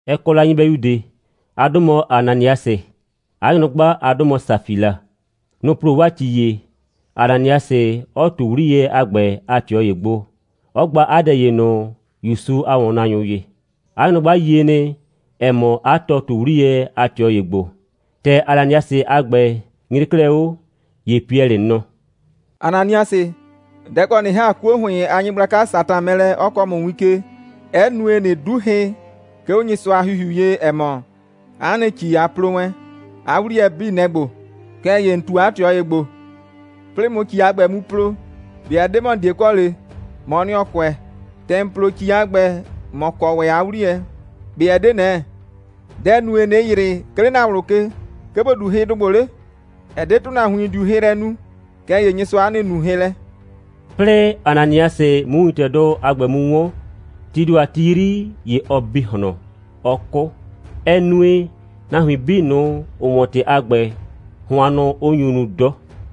Ɛ kɔ la nyɩbɛyu ꞊de. 'A 'dʋ mɔ Ananiasɩ. 'A nyrʋgba a 'dʋ mɔ Safila. Nʋ‑ plo 'waa ‑ci ‑ye, Ananiasɩ 'ɔ ꞊tu 'wliyɛ a ‑gbɛ a ꞊tɩɔ ‑ye gbo, 'ɔ gba 'a dɛ ‑ye ꞊nʋ ‑Yusu a ‑wɔnnaanyʋ ye. 'A nyrʋgba yie nɩ, ‑ɛ mɔ, 'a tɔ ꞊tu 'wliyɛ a ꞊tɩɔ ‑ye gbo. ‑Tɛ Ananiasɩ a ‑gbɛ nyre 'klɛɛ 'o, ‑ye Piɛlɩ nɔ: «Ananiasɩ, dɛ‑ kɔ ꞊nɩ ‑ha 'kuo ‑hʋɩn a nyɩgblaka Satan mɛ lɛ, 'ɔ kɔɔ ‑mʋ win ke, 'ɛ nue, ꞊nɩ 'du hɩ, 'ke 'o Nyɩsʋa a ‑Hihiu ye, ‑ɛ mɔ, 'a nɩ ‑ci, a plo wɛn, 'a 'wliyɛ 'bii, nɛ‑ ‑gbo? Kɛɛ ‑ye ‑n ꞊tu 'a ꞊tɩɔ ‑ye gbo. 'Plɩɩ ꞊mʋ ‑ci a ‑gbɛ mu plo, ꞊be ɛ 'de ‑mɔ, ‑n 'die kɔ ‑le? ‑Mɔɔ nɩ, ‑ɔ kʋɛ. ‑Tɛ ‑n plo ‑ci a ‑gbɛ, ‑mɔ kɔ ‑wɛ 'a 'wliyɛ. ꞊Be ɛ 'de ꞊nɛ? Dɛ‑ nue, ꞊nɩ ‑yrɩ, 'ke 'le ‑na ꞊wlʋ ke, 'ke ‑bo 'du hɩdʋ ‑gbo 'le? Ɛ 'de ‑tʋnahuin, ‑n 'diu hɩ lɛ nu, kɛɛ ‑ye Nyɩsʋa'a nɩ, ‑n nuu hɩ lɛ.» 'Plɩɩ Ananiasɩ 'mʋ wintɛdʋ a ‑gbɛ mu 'wɔn, tii ‑do a ti 'yri, ‑ye ɔ bi ꞊hlɔn, 'ɔ 'kʋ. Ɛ nue, nahuin 'bii ꞊nʋ, ‑ʋ 'wɔn ‑tɩ a ‑gbɛ, hʋannʋ 'ʋ nyu nu 'dɔ.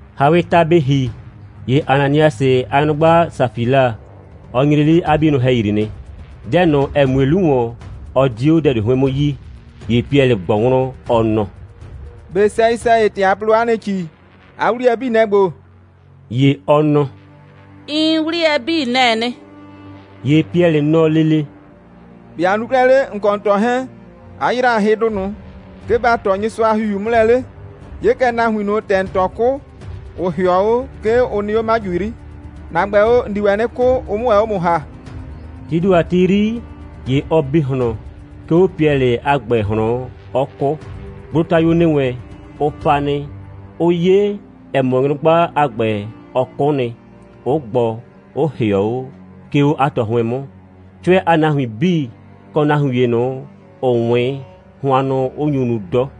‑Hawɩɩ ta bɩ ‑hi, ‑ye Ananiasɩ a nyrʋgba Safila, ɔ nyre 'le 'a 'bienʋ ‑hɛyri nɩ. Dɛ ꞊nʋ, ‑ɛ mue 'lu ‑wɔn, ɔ 'die 'o dɛ ꞊de 'hʋɩn 'mʋ yi. ‑Ye Piɛlɩ ꞊gbɔ wlɔn, ɔ nɔ: «꞊Be sɛyɩ‑sɛyɩ, ‑tɛ a plo 'a nɩ ‑ci, 'a 'wliyɛ 'bii, nɛ‑ ‑gbo?» ‑Ye ɔ nɔ: «Iin, 'wliyɛ 'bii, nɛ‑ɛ nɩ.» ‑Ye Piɛlɩ nɔ lele: «‑Be' a nu 'klɛɛ 'le, ‑n kɔ ‑n tɔ 'hɛɛn, 'a ‑yra hɩdʋ ꞊nʋ, 'ke ba ꞊tɔ Nyɩsʋa a ‑Hihiu 'mʋ lɛ 'le? 'Ye kɛ, nahuin ꞊nʋ, ‑tɛ ‑n tɔ 'kʋ, ‑ʋ ‑hɩɔ 'o, 'ke ʋ nɩ 'o 'maju 'yri. ‑Na ‑gbɛ o, ‑n di ‑wɛ 'nɩ 'kʋ, ʋ 'mʋ ‑wɛ 'o ‑mʋ ‑ha.» Tii ‑do a ti 'yri, ‑ye ɔ bi ꞊hlɔn, 'ke 'o Piɛlɩ a ‑gbɛ ꞊hlɔn, 'ɔ 'kʋ. Gblotayuo ‑nɩ wɛn, ʋ pa nɩ, 'ʋ 'ye, ‑ɛ mɔ, nyrʋgba a ‑gbɛ, ɔ 'kʋ nɩ, 'ʋ gbɔ, 'ʋ ‑hɩɔ 'o, 'ke 'o 'a tɔ 'hʋɩn 'mʋ, 'cʋɛ a nahuin 'bii, kɔ nahuin ‑ye ꞊nʋ, ‑ʋ 'wɩn, hʋannʋ 'ʋ nyu nu 'dɔ.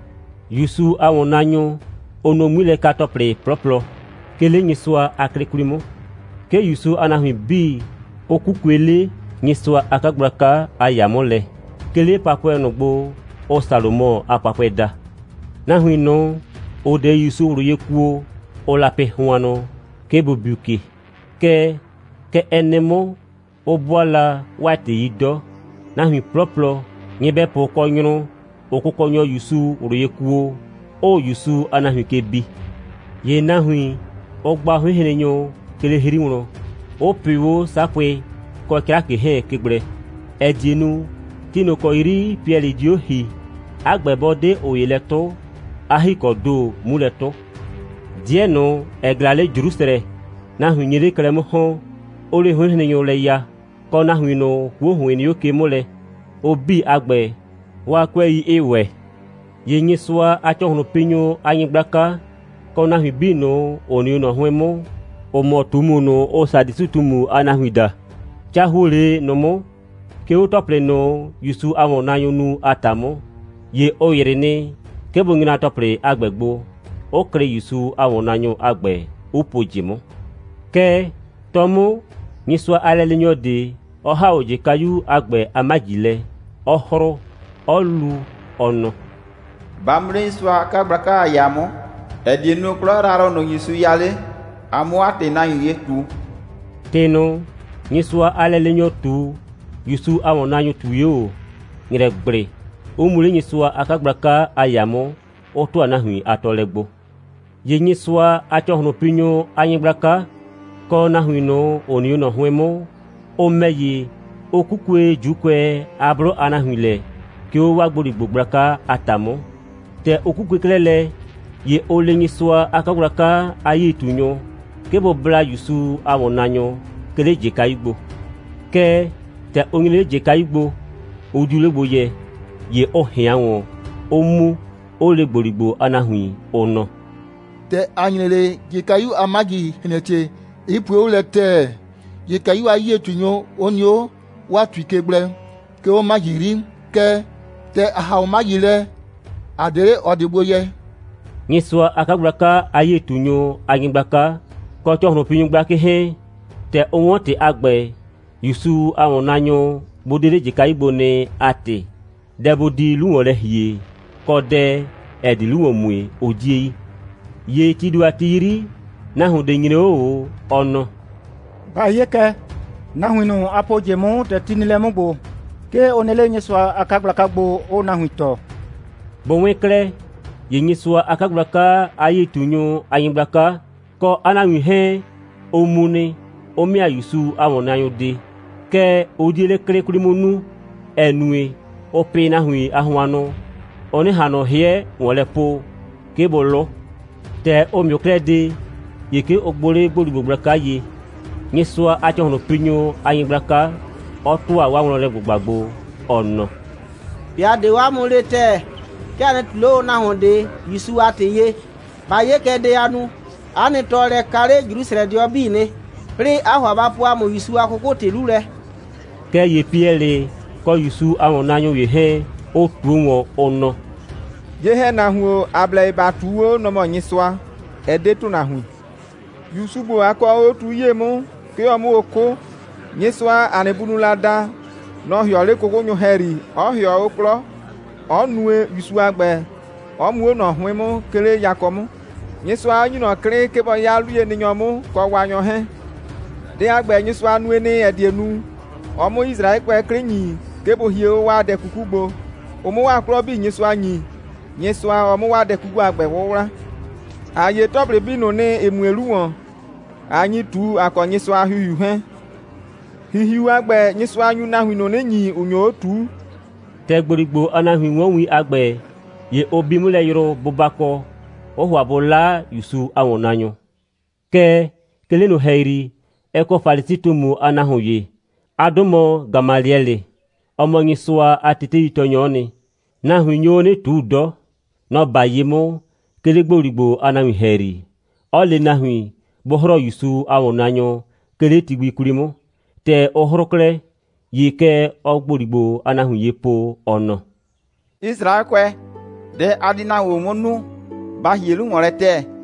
‑Yusu a ‑wɔnnaanyʋ, ʋʋ nu 'ŋmilɛka‑tɔplɩ 'plɔplɔ, 'ke 'le Nyɩsʋa a 'klɩ 'kwli 'mʋ. 'Ke ‑Yusu a nahuin 'bii, ʋ 'kukue 'le Nyɩsʋa a 'kagblaka a ‑yaa 'mʋ lɛ, 'ke 'le papʋɛ ꞊nʋ gbo, ʋʋ Salomɔ a papʋɛ daa. Nahuin ꞊nʋ, ‑ʋ 'de ‑Yusu ꞊wlʋ ye kuo, ʋʋ la pɩ hʋannʋ, 'ke bʋ biu ke. Kɛɛ, kɛ ɛ nɩ 'mʋ, 'ʋ 'bʋaa la 'waa ‑tɩ 'yi 'dɔ, nahuin 'plɔplɔ, nyɩbɛpʋ kɔ nyrʋ, 'ʋʋ Kʋkɔnyɔ ‑Yusu ꞊wlʋ ye kuo, 'ʋʋ ‑Yusu a nahuin ke bi. ‑Ye nahuin, ʋʋ gba 'hʋɩnhrennyʋ 'ke 'le 'hri wlɔn, 'ʋ pɩʋ 'o 'sapʋɩ kɔ 'crakɩ 'hɛɛn ke gblɛ, ‑ɛ die nu, ti ꞊nʋ ‑kɔ 'yri Piɛlɩ di 'o ‑hii, 'a ‑gbɛ 'bɔ 'de ꞊ʋ ‑ye lɛ 'tʋ, 'a ‑hikɔɔ ‑do 'mu lɛ 'tʋ. 'Dɩɛ ꞊nʋ, ‑ɛ ꞊glaa 'le Jrusrɛ, nahuin nye 'le klɛ 'mʋ ‑hɔn, 'ʋʋ 'le 'hʋɩnhrennyʋ lɛ ya, kɔ nahuin ꞊nʋ, 'kuo ‑hʋɩn nɩ 'o ke 'mʋ lɛ, ʋ 'bii a ‑gbɛ, 'waa 'kʋɛi 'ɩɩ ‑wɛ. ‑Ye Nyɩsʋa a ‑cɔhlʋnpinyʋ a nyɩgblaka, kɔ nahuin 'bii ꞊nʋ, ‑ʋ nɩ 'o ꞊nɔ 'hʋɩn 'mʋ, ‑ʋ mɔ ꞊tumu ꞊nʋ, ʋʋ Sadusɩ꞊tumu a nahuin daa, ca ‑huo 'le ꞊nʋ 'mʋ, 'ke 'o ‑tɔplɩ ꞊nʋ, ‑Yusu a ‑wɔnnaanyʋʋ nu a ‑ta 'mʋ. ‑Ye ʋ ‑yrɩ nɩ, 'ke bʋ nyra ‑tɔplɩ a ‑gbɛ gbo, 'ʋ klɩ ‑Yusu a ‑wɔnnaanyʋ a ‑gbɛ, 'ʋ pu ꞊jɩ 'mʋ. Kɛɛ, 'tɔ 'mʋ, Nyɩsʋa a lɛleenyɔ ꞊de, 'ɔ ‑ha 'o ꞊jɩkayu a ‑gbɛ a 'maji lɛ, 'ɔ 'hrʋʋ, 'ɔ lu, ɔ nɔ: «Ba mu 'le Nyɩsʋa a 'kagblaka a ‑yaa 'mʋ, ‑ɛ die nu, 'klɔ yrayrʋ ꞊nʋ, ‑Yusu ya 'le, a 'mʋ 'a ‑tɩ nahuin ye ꞊tu.» ‑Tɩ ꞊nʋ, Nyɩsʋa a lɛleenyɔ ꞊tu, ‑Yusu a ‑wɔnnaanyʋ ꞊tui 'o ꞊o. ‑Nyrɛgblɩ, 'ʋ mu 'le Nyɩsʋa a 'kagblaka a ‑yaa 'mʋ, 'ʋ ‑tʋa nahuin a tɔɔlɛ gbo. ‑Ye Nyɩsʋa a ‑cɔhlʋnpinyʋ a nyɩgblaka, kɔ nahuin ꞊nʋ, ‑ʋ nɩ 'o ꞊nɔ 'hʋɩn 'mʋ, ʋ ‑mɛ ‑ye, ʋ 'kukue ‑Juukʋɛ a 'blʋ a nahuin lɛ, 'ke 'o 'waa ‑gboligbo gblaka a ‑ta 'mʋ. ‑Tɛ ʋ 'kukue 'klɛɛ lɛ, ‑ye ʋ le Nyɩsʋa a 'kagblaka a 'yie꞊tunyʋ, 'ke bʋ bla ‑Yusu a ‑wɔnnaanyʋ, 'ke 'le ꞊jɩkayu gbo. Kɛɛ, ‑tɛ ʋ nyre 'le ꞊jɩkayu gbo, ʋ 'diu 'le gbo yɛ. ‑Ye ʋ ꞊hɩan ‑wɔn, 'ʋ mu, 'ʋ le ‑gboligbo a nahuin, ʋ nɔ: «‑Tɛ ‑a nyre 'le, ꞊jɩkayu a 'maji ‑hlɛntie, 'ɩ pue 'o lɛ ‑tɛɛ, ꞊jɩkayu a 'yie꞊tunyʋ 'ʋ nɩ 'o 'waa ‑tui ke gblɛ, 'ke 'o 'maji 'yri. Kɛɛ, ‑tɛ ‑a ‑ha 'o 'maji lɛ, ‑a 'de 'le ꞊ɔ ꞊de gbo yɛ.» Nyɩsʋa a 'kagblaka a 'yie꞊tunyʋ a nyɩgblaka, kɔ ‑cɔhlʋnpinyʋ gblakɩ 'hɛɛn, ‑tɛ ʋ 'wɔn ‑tɩ a ‑gbɛ, ‑Yusu a ‑wɔnnaanyʋ bʋ 'de 'le ꞊jɩkayu gbo nɩ a ‑tɩ, dɛ bʋ di 'lu ‑wɔn lɛ ‑hie, kɔ dɛ, ‑ɛ di 'lu ‑wɔn mue, ʋ 'die yi. ‑Ye tii ‑do a ti 'yri, nahuon ꞊de nyre 'o ꞊o, ɔ nɔ: «Ba 'ye kɛ, nahuin ꞊nʋ, a po ꞊jɩ 'mʋ, ‑tɛ ti nɩ lɛ 'mʋ ‑gbo, 'ke ʋ nɩ 'le Nyɩsʋa a 'kagblaka gbo, 'ʋʋ nahuin tɔɔ.» Bʋ 'wɩn 'klɛɛ, ‑ye Nyɩsʋa a 'kagblaka a 'yie꞊tunyʋ a nyɩgblaka, kɔ 'a nahuin 'hɛɛn, ʋ mu nɩ, 'ʋ ‑mɩa ‑Yusu a ‑wɔnnaanyʋ de. Kɛɛ, ʋ 'die 'le 'klɩ 'kwli 'mʋ nuu, ‑ɛ nue, ʋʋ pɩ nahuin a hʋannʋ, ʋ 'nɩ ꞊han ꞊nʋ 'hɩɛ ‑wɔn lɛ po, 'ke bʋ 'lʋ. ‑Tɛ ʋ ‑mɩʋ 'klɛɛ de, ‑ye 'ke ʋ gbʋ 'le ‑gboligbo gblaka ye, Nyɩsʋa a ‑cɔhlʋnpinyʋ a nyɩgblaka 'ɔ ‑tʋa 'waa wlɔnlɛ꞊gbʋgba gbo, ɔ nɔ: «꞊Be ‑a 'de o 'a mʋ le ‑tɛɛ, 'ke a nɩ ꞊tu 'le o nahuon ꞊de ‑Yusu a ‑tɩ ye. Ba 'ye kɛ dɛ, a nu. 'A nɩ tɔɔlɛ ka 'le Jrusrɛdɩɔ 'bii nɩ, 'plɩɩ, 'aa ‑hʋa ba po ‑a mʋ ‑Yusu a 'kʋkʋ‑tɩ 'lu lɛ.» Kɛɛ ‑ye Piɛlɩ kɔ ‑Yusu a ‑wɔnnaanyʋ ‑ye 'hɛɛn, ʋ ꞊tuo ‑wɔn, ʋ nɔ: «Ye‑hɛnahuon, ‑a blɛ ye ‑ba ꞊tuu 'o, nɔ‑ mɔ Nyɩsʋa, ɛ 'de ‑tʋnahuin. ‑Yusu ‑gbo, a kɔɔ o 'o tu 'yie 'mʋ, 'ke ɔ 'mʋ o 'kʋ, Nyɩsʋa, ‑a nɩ bunʋʋ la da, nɔ‑ ‑hɩɔ o 'le 'kʋkʋnyʋ ‑hɛyri, 'ɔ ‑hɩɔ o 'klɔ, 'ɔ nue, ‑Yusu a ‑gbɛ 'ɔ mu 'o ꞊nɔ 'hʋɩn 'mʋ, 'ke 'le yakɔ 'mʋ, Nyɩsʋa 'ɔ ‑nyi ꞊nɔ 'klɩ, 'ke bɔ 'ya 'luyenɩnyɔ 'mʋ kɔ Waanyɔ 'hɛɛn. Dɛ a ‑gbɛ, Nyɩsʋa nue nɩ, ‑ɛ die nu, ɔ 'mʋ Yisraɛkʋɛ 'klɩ ‑nyi, 'ke bʋ hie 'o 'waa dɛ 'kuku gbo, ʋ 'mʋ 'waa 'klɔ 'bii Nyɩsʋa ‑nyi, Nyɩsʋa, ɔ 'mʋ 'waa dɛ 'kuku a ‑gbɛ 'wʋwla. ‑A 'ye ‑tɔplɩ 'bii ꞊nʋ nɩ, ‑ɩ mue 'lu ‑wɔn, ꞊a nyi ꞊tu, ‑a kɔ Nyɩsʋa a ‑Hihiu 'hɛɛn. ‑Hihiu a ‑gbɛ, Nyɩsʋa nyu nahuin ꞊nʋ 'nɩ ‑nyi, ‑ʋ nyo 'o ꞊tuu.» ‑Tɛ ‑gboligbo a nahuin 'wɔn win a ‑gbɛ, ‑ye ʋ bi 'mʋ lɛ yrʋ bʋbakɔ, 'ʋʋ ‑hʋa bʋ 'la ‑Yusu a ‑wɔnnaanyʋ. Kɛɛ, 'ke 'le ꞊nʋ ‑hɛyri, ɛ kɔ Falisi꞊tumu a nahuon ‑ye. 'A 'dʋ mɔ Gamaliɛlɩ. Ɔ mɔ Nyɩsʋa a teteitɔɔnyɔ'ɔ nɩ. Nahuin nyo 'o 'nɩ ꞊tuu 'dɔ. Nɔ‑ 'ba ye 'mʋ, 'ke 'le ‑gboligbo a nahuin ‑hɛyri, 'ɔ le nahuin, bʋ 'hrɔɔ ‑Yusu a ‑wɔnnaanyʋ, 'ke 'le ti gbi 'kwli 'mʋ. ‑Tɛ ʋ 'hrʋʋ 'klɛɛ, ‑ye kɛ ɔɔ ‑gboligbo a nahuin ye po, ɔ nɔ: «Yisraɛkʋɛ, dɛ a di nahuin ‑gbo 'mʋ nu, ba ‑hie 'lu ‑wɔn lɛ ‑tɛɛ.»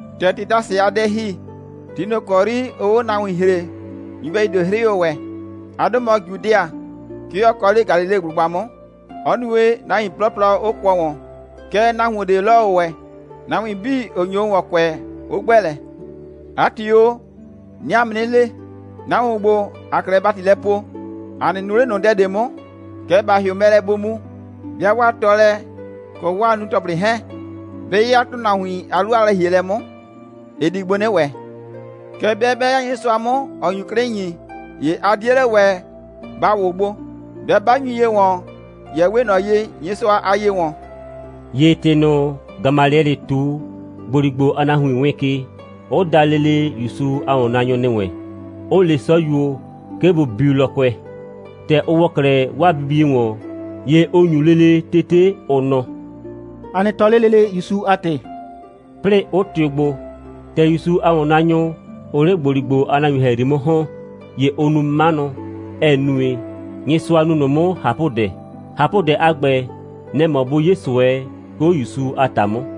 ‑Tɛ Tedasɩ a dɛ ‑hi, ti ꞊nʋ ‑kɔ 'yri ʋʋ o 'o nahuin ‑hree, nyɩbɛyu ꞊de 'hrɩ o ‑wɛ. 'A 'dʋ mɔ Judɩa. 'Ke ɔ kɔ 'le Galileblʋgba 'mʋ; 'ɔ nue, nahuin 'plɔplɔ 'ʋ kʋɔ ‑wɔn. Kɛɛ, nahuon ꞊de 'lɔ o ‑wɛ, nahuin 'bii, ‑ʋ nyo o ‑wɔn kʋɛ, 'ʋ ‑gbɛ lɛ. 'A ‑tɩ o, 'nɩɩ 'a mʋ 'nɩ le, nahuin ‑gbo, ‑aa 'klɛɛ ‑bati lɛ poo, a nɩ nu 'le ꞊nʋ dɛ ꞊de 'mʋ! Kɛɛ, ba ‑hɩʋ mɛ lɛ, bʋ mu. 'Bɩa 'waa tɔɔlɛ kɔ 'waa nunu‑tɔplɩ 'hɛɛn, 'bɩ 'ya ‑tʋnahuin a 'lu a lɛ‑hielɛ 'mʋ, ɩ di gbo 'nɩ ‑wɛ. Kɛɛ, 'bɩa 'bɛ 'ya Nyɩsʋa 'mʋ, ‑ɔ nyu 'klɩ ‑nyi, ‑ye a 'die 'le ‑wɛ ba ‑wʋ gbo. 'Bɩa 'ba nyu ye ‑wɔn, ‑ye ɛ 'we ꞊nɔ ye, Nyɩsʋa aa ye ‑wɔn.» ‑Ye ‑tɩ ꞊nʋ, Gamaliɛlɩ ꞊tu, ‑gboligbo a nahuin wɩɩn ke, 'ʋ da lele ‑Yusu a ‑wɔnnaanyʋ ‑nɩ wɛn, 'ʋ le 'sɔyuo, 'ke bʋ biu lɔkʋɛ. ‑Tɛ ʋ ‑wɔ 'klɛɛ 'waa bibie ‑wɔn, ‑ye ʋ ‑nyu lele tete, ʋ nɔ: «A nɩ tɔɔ 'le lele ‑Yusu a ‑tɩ,» 'plɩɩ 'ʋ tɩʋ gbo. ‑Tɛ ‑Yusu a ‑wɔnnaanyʋ, ʋʋ 'le ‑gboligbo a nahuin ‑hɛyri 'mʋ ‑hɔn, ‑ye ʋʋ nu 'manʋ, ‑ɛ nue, Nyɩsʋa nu ꞊nʋ 'mʋ ꞊hapʋdɛ. ꞊Hapʋdɛ a ‑gbɛ, nɛ‑ mɔ bʋ 'ye ꞊sʋɛ, 'ke 'o ‑Yusu a ‑ta 'mʋ.